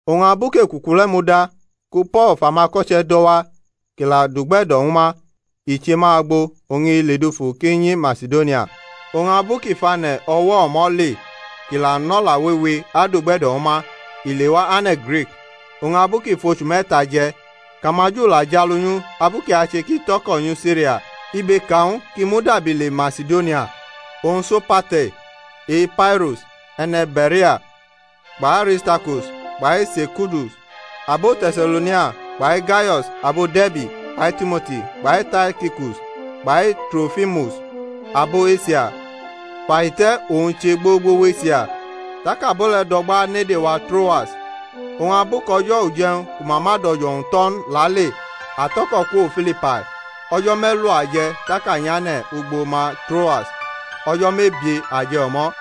Oñ abu kʼe̩kuku le̩ muda, ku Po̩l fʼumako̩che̩ do̩ wa kʼi la dugbe̩do̩ ñw ma, i che ma agbo̩ oñ i le dufu kʼi nyi Masidonia. Oñ abu kʼi fʼane̩ o̩wo̩ o̩mo̩ le, kʼi la nʼo̩la wewe adugbe̩do̩ ñw ma, i lewa ane̩ Grik. Oñ abu kʼi fʼochu me̩ta je̩, kʼamaJu la jʼalu nyʼu abu kʼi ache kʼi tʼo̩ko̩ nyi Siria, ibe ka ñw u kʼi mudabi le Masidonia. Oñ Sopater e-Pairus e̩ne̩ Be̩rea, kpʼAristarkus kpai Sekundus abo Te̩se̩lo̩nia kpai Gayo̩s abo De̩rbi kpai Timoti kpai Taikikus kpai Trofimus abo Esia fʼahite̩ owñ che gbogbo wʼEsia. Tak abo le̩ do̩gba unede wa Troas. Oñ abu kʼo̩jo̩ uje̩wñ ku ma ma dʼo̩jo̩wu tʼo̩ n lale a tʼo̩ko̩ kwo Filipai; o̩jo̩ me̩lu a je̩ tak a nyane̩ ugbo ma Troas. O̩jo̩ mebie a je̩ o̩mo̩.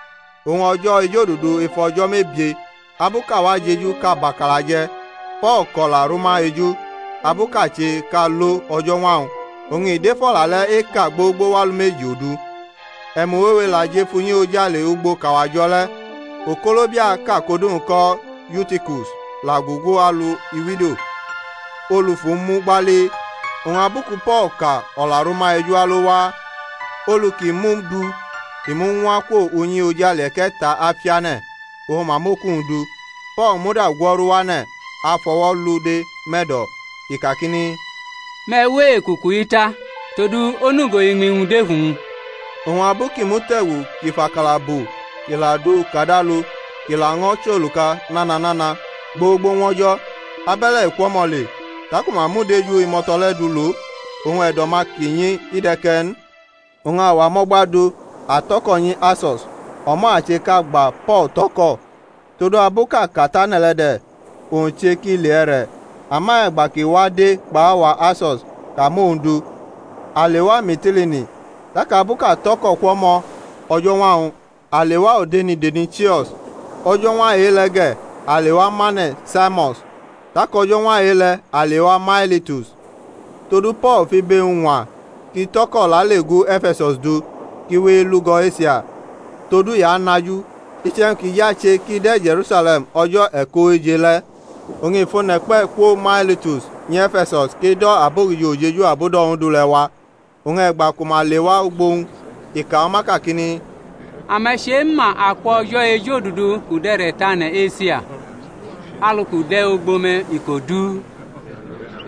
Oñ o̩jo̩ ejodudu ef o̩jo̩ mebie, abu kʼawa jeju kʼa bʼakala je̩ Po̩l kʼo̩la rʼuma eju, abu kʼa che kʼa lo o̩jo̩ñwa-wñ; oñ i dʼef o̩la le̩ eka gbogbo wʼalumeji odu. E̩mu wewe la jʼef unyi ojale ugbo kʼawa jo̩ le̩. Okolobiaʼka kʼodu-wñ ko̩ Yutikus la gugu alu iwido, olu fʼu mu gbali; oñ abu ku Po̩l ka o̩la rʼuma eju alo waa, olu ki mʼu du i muñwa kwo unyi ojale e̩ke̩ta afiane̩, oñ ma mʼoku-wñ du. Po̩l muda gwo̩ru wane̩ afʼo̩wo̩ lʼu de̩ mʼe̩do̩, i kakini, Me̩ we ekuku-i ta: todu onugo iñmi-wñ dʼef uwñ. Oñ abu kʼi mute̩gu kʼi fʼakala bu kʼi la dʼu kad alu kʼi laño̩ chʼoluka nana nana gbogbo ñwʼo̩jo̩, abe̩le̩ i kwʼo̩mo̩ le. Taku ma mʼudeju imo̩to̩ le̩ du lo, oñ e̩do̩-ma kʼi nyi i de̩ ke̩ n. Oñ awa mʼo̩gba du, a tʼo̩ko̩ nyi Aso̩s, o̩mo̩ a che kʼa gba Po̩l tʼo̩ko̩; todu abu kʼa ka tane̩ le̩ de̩; owñ che kʼi le e̩re̩. Ama e̩gba kʼi wa de̩ kpʼawa Aso̩s kʼa mʼowñ du, a lewa Mitilini. Tak abu kʼa tʼo̩ko̩ kwo̩mo̩ o̩jo̩ñwa-wñ a lewa odenideni Chio̩s, o̩jo̩ñwa e-le̩ ge̩ a lewa mane̩ Samo̩s; tak o̩jo̩ñwa e-le̩ a lewa Mailitus: todu Po̩l fʼibe-wñ ñwa kʼi tʼo̩ko̩ lale gu E̩fe̩-sus du, kʼi we elugo̩ Esia; todu i anaju, iche̩wñ ki je̩ ache kʼi de̩ Je̩rusale̩m o̩jo̩ e̩kʼooje le̩. Oñ i fʼone̩ kpe̩ kwo Mailitus nyʼE̩fe̩sus kʼi do̩ abogijo ujeju abudo̩ Ondu le̩ wa. Oñ e̩gba ku ma lewa ugbo owñ i ka ñw ma kakini, Ame̩ chema, akwʼo̩jo̩ ejodudu kʼu dʼe̩re̩ tʼane̩ Esia, alu kʼu de̩ ugbo me̩ iko du,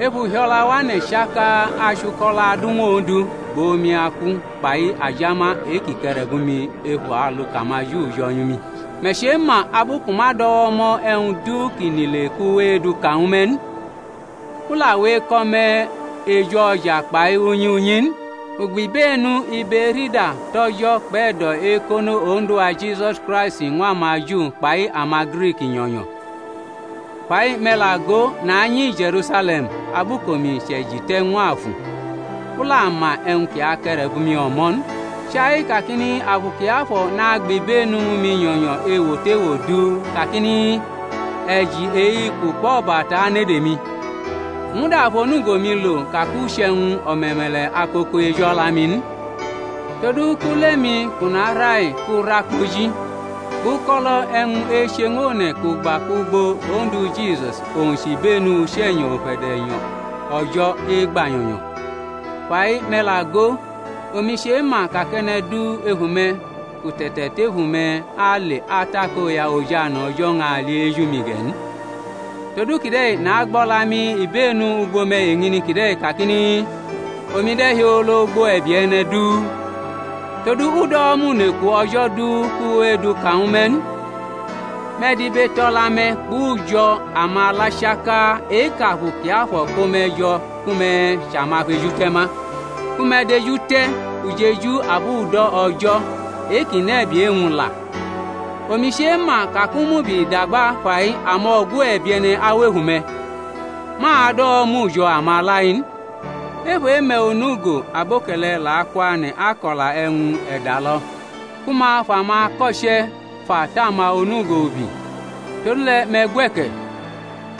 ef uhio̩la wane̩ chaka achuko̩lo̩ adu ñw Ondu, kpʼomi-aku kpai ajama e-kʼi ke̩re̩bʼomi ef alu kʼamaJu jo̩ nyu mi. Me̩ chema abu kʼu ma dʼo̩wo̩ mo̩ e̩wñ du ki nʼile kʼu we eduka ñw me̩ n, u la we eko̩ me̩ ejʼo̩ja kpai unyi unyi n. U gbibenu ibe-erida tʼO̩jo̩ kpʼe̩do̩-ekono Ondu-wa Jisus Kraisti ñw amaJu kpai amaGrik nyo̩nyo. Fai, me̩ la go, nanyi Je̩rusale̩m abu kʼomi chʼe̩ji te̩ ñw afu, u la ma e̩wñ ki ake̩re̩bʼumi o̩mo̩ n: chai kakini Afu Kiafo̩ nagbʼibenu ñw mi nyo̩nyo̩ ewo tʼewo du kakini e̩ji e-iku kpʼo̩bata anede mi. U muda fʼonugo-mi lo ka kʼu chʼe̩wñ o̩me̩me̩le̩ akoko ejʼo̩la-mi n, todu kʼule-mi kʼu nara-i kʼu ra kpoji kpʼuko̩lo̩ e̩wñ eche ñw one̩ kʼu gba kwugbo Ondu Jisus owñ chʼibenu Uche̩nyo̩ ufe̩de̩nyo̩ O̩jo̩ egba nyo̩nyo̩. Fa-i me̩ la go, omi chema ka kʼe̩ne̩ du ef ume̩ kʼu te̩te̩tefu me̩ ale atakoya ojane̩ O̩jo̩ ñʼali eju-mi ge̩ n. Todu kide̩ nagbo̩la-mi ibenu ugbo me̩ eñini kide̩ kakini, Omi de̩hiolo ugbo e̩bie̩ e̩ne̩ du, todu u dʼo̩wo̩ mʼuneku O̩jo̩ du kʼu we eduka ñw me̩ n. Me̩ dibetʼo̩la-me̩ kpʼujo̩ amala chaka e-kʼAfu Kiafo̩ ko me̩ jo̩ ku me̩ chʼamafejute̩ ma ku me̩ dejute̩ ujeju abudo̩ O̩jo̩ e-kʼi nʼe̩bie̩ e-wñ la. Omi chema ka kʼu mʼubi dagba fai amo̩gu e̩bie̩ne̩ awʼef ume̩, ma ado̩wo̩mʼujo̩ amala-i n. Ef e-me̩ onugo aboke̩le̩ la akwane̩ ako̩la e̩wñ e̩dalo̩ ku ma fʼamako̩che̩ fa tʼama onugo ubi. Todule̩ me̩ gwe̩ke̩,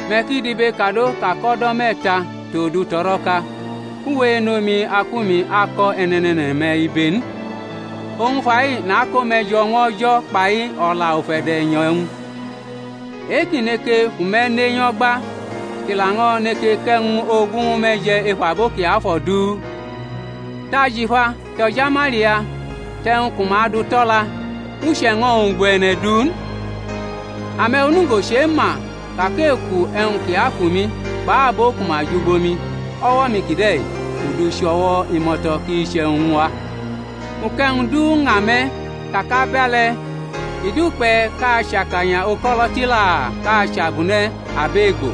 me̩ ki dibekado ka kʼo̩do̩ me̩ta, tʼodu tʼo̩ro̩ka u we enʼomi aku-mi ako̩ e̩ne̩ne̩ne̩ne̩-me̩ ibe n. Oñ fa-i nako me̩ jo̩ ñw O̩jo̩ kpai o̩la ufe̩de̩nyo̩-wñ e-kʼi neke fʼume̩ ne nyo̩gba, kʼi laño̩ neke kʼe̩wñ-ogu ñw me̩ je̩ ef abo kiafo̩ du. Tʼajifa, tʼajamalia, tʼe̩wñ ku ma du tʼo̩la u che̩ño̩-wñ ugbo e̩ne̩ du n. Ame̩ onugo chema ka kʼeku e̩wñ kʼi ku mi kpʼabo ku ma jʼugbo-mi o̩wo̩-mi kide̩ u du chʼo̩wo̩ imo̩to̩ kʼi chʼe̩wñ ñw a. U kʼe̩wñ du ña me̩ ka kʼabe̩le̩ i dukpe̩ kʼa achʼakanya uko̩lo̩ tila kʼa chʼabune̩ abʼe̩gbo,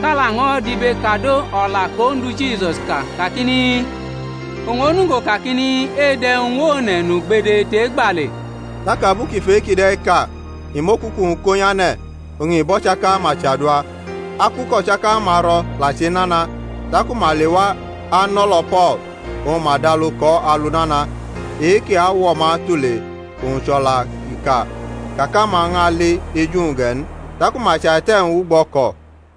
kʼa laño̩ dibekado O̩la kʼOndu Jisus ka, kakini, Owñ onugo kakini, Edu e̩wñ ñw one̩ nʼugbede tʼe̩gba le. Tak abu kʼi fʼe-kide̩ ka i mʼokuku-wñ ko nyane̩ oñ i bʼo̩chaka-ma chadua. Aku kʼo̩chaka-ma ro̩ la chenana; taku ma lewa anʼo̩lo̩ Po̩l oñ ma dʼalu kʼo̩ alu nana, e-kʼi awo̩ ma tule oñ chʼo̩la kʼi ka kakʼama ñʼali eju-wñ ge̩ n. Taku ma chaite̩-wñ wʼugbo o̩ko̩.